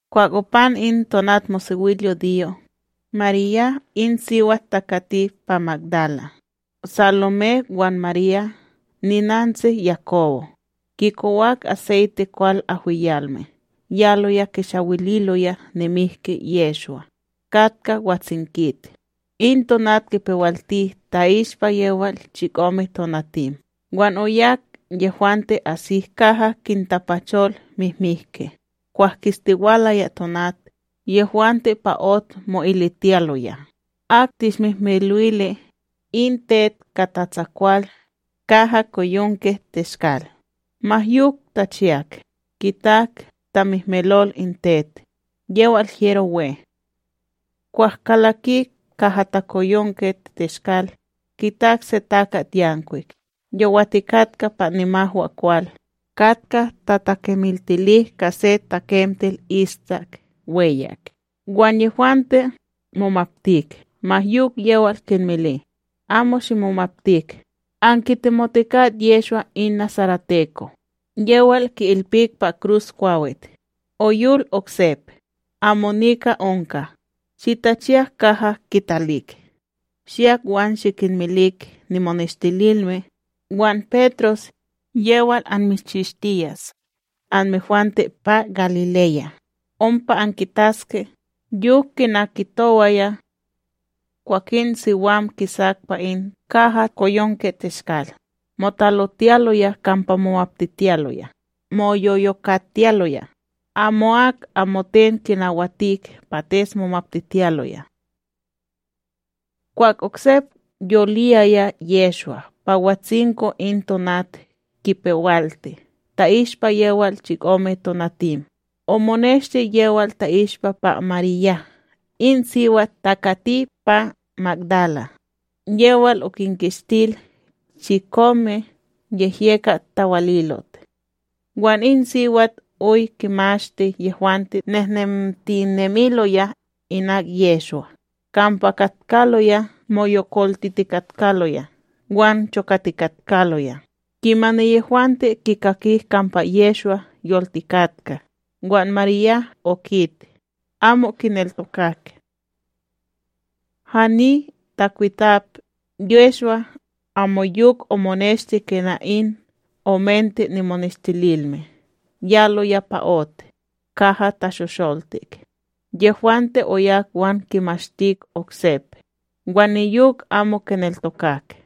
Kwah opan in tonatmosewilyudiyo, Marya in siwat takati pa Magdala, Salomé wan Marya ninantsi Yakobo, kikowak aseyte kwal ahwiyalme yaloya kishawililoya nimihki Yehshwa. Katka watsinkit, in tonat kipewalti ta'ishpa yewal chikomeTonatim wan oyak yehwante asik kaha kintapachol mihmihki, kwah kistiwalaya tonat. Yehwante pa ot mo'ilitiyaloya: ―Ak tishmihmilo'ili in tet ka tatsakwal kahakoyonkeTeshkal? Ma yok tachiyak, kitak tamihmilol in tet, yewal hyero we. Kwah kalakik kahakoyonkeTeshkal, kitak se takatYankwik yowatikatka pa nimahwakwal, katka tatakemiltili ka se takemtel istak weyak; wan yehwante momaptik. Ma yok yewal kinmili: ―Amo shimomaptik; ankitemotikat Yehshwa in nasareteko, yewal ki'ilpik pa kruskwawit. Oyol oksep; amo nika onka. Shitachiyak kaha kitalik. Shiyak wan shikinmilik nimoneshtililme, wan Petros: “Yewal anmishchishtiyas anmehwante pa Galileya ompa ankitaske, yok kina kitowaya.” Kwakin siwam kisak pa in kahakoyonkeTeshkal, motalotiyaloya kampa momaptitiyaloya, moyoyokatiyaloya. Amo'ak amoten kinawatik pates momaptitiyaloya. Kwah oksep yoliyaya Yehshwa pa watsinko in tonat kipewalti ta'ishpa yewal chikomeTonatim, omoneshti yewal ta'ishpa pa Marya in siwat takati pa Magdala, yewal okinkishtil chikome niyehyekat tawalilot. Wan in siwat oy kinmashti yehwante nehnemtinemiloya inak Yehshwa, kampa katkaloya moyokoltitikatkaloya wan chokatikatkaloya. Kimani yehwante kikakik kampa Yehshwa yoltikatka, wan Marya okit, amo kineltokak. Hani takwitap, Yehshwa amoyok omoneshti ka in omente nimoneshtililme yaloya pa ot kaha tashosholtik. Yehwante oyak wan kinmashtik oksek; wan niyok amo kineltokak.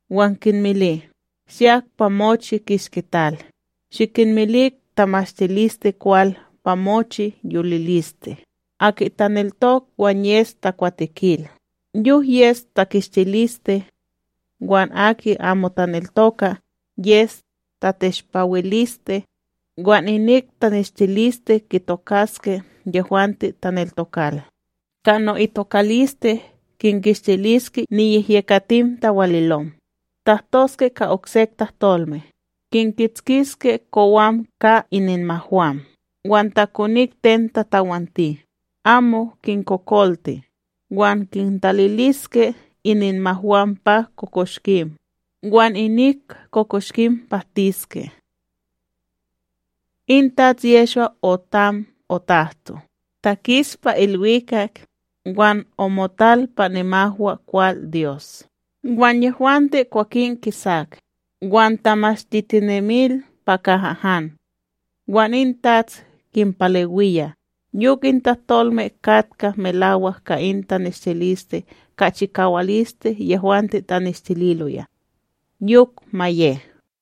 Wan kinmili: ―Shiyak pa mochi kishki tal, shikinmilik tamashtilisteKwal pa mochi yoliliste. Aki taneltok wan yes takwatekil, yok yes takishtiliste; wan aki amo taneltoka, yes tateshpawiliste. Wan inik taneshtiliste kitokaske yehwante taneltokal: Ka no'itokaliste kinkishtiliske niyehyekatim tawalilom; tahtoske ka oksek tahtolme; kinketskiski kowam ka ininmahwam, wan ta konik ten tatawanti, amo kinkokolti; wan kintaliliske ininmahwam pa kokoshkim wan inik kokoshkim pahtiske. In TATS Yehshwa otam otahto, takis pa ilwikak wan omotal pa nimahwakwalDyos. Wan yehwante kwakin kisak, wan tamashtitinemil pa kaha han. Wan in TATS kinpalewiya, yok in tahtolme katka melawak ka in taneshtiliste ka chikawaliste yehwante tanishtililoya. Yok ma ye.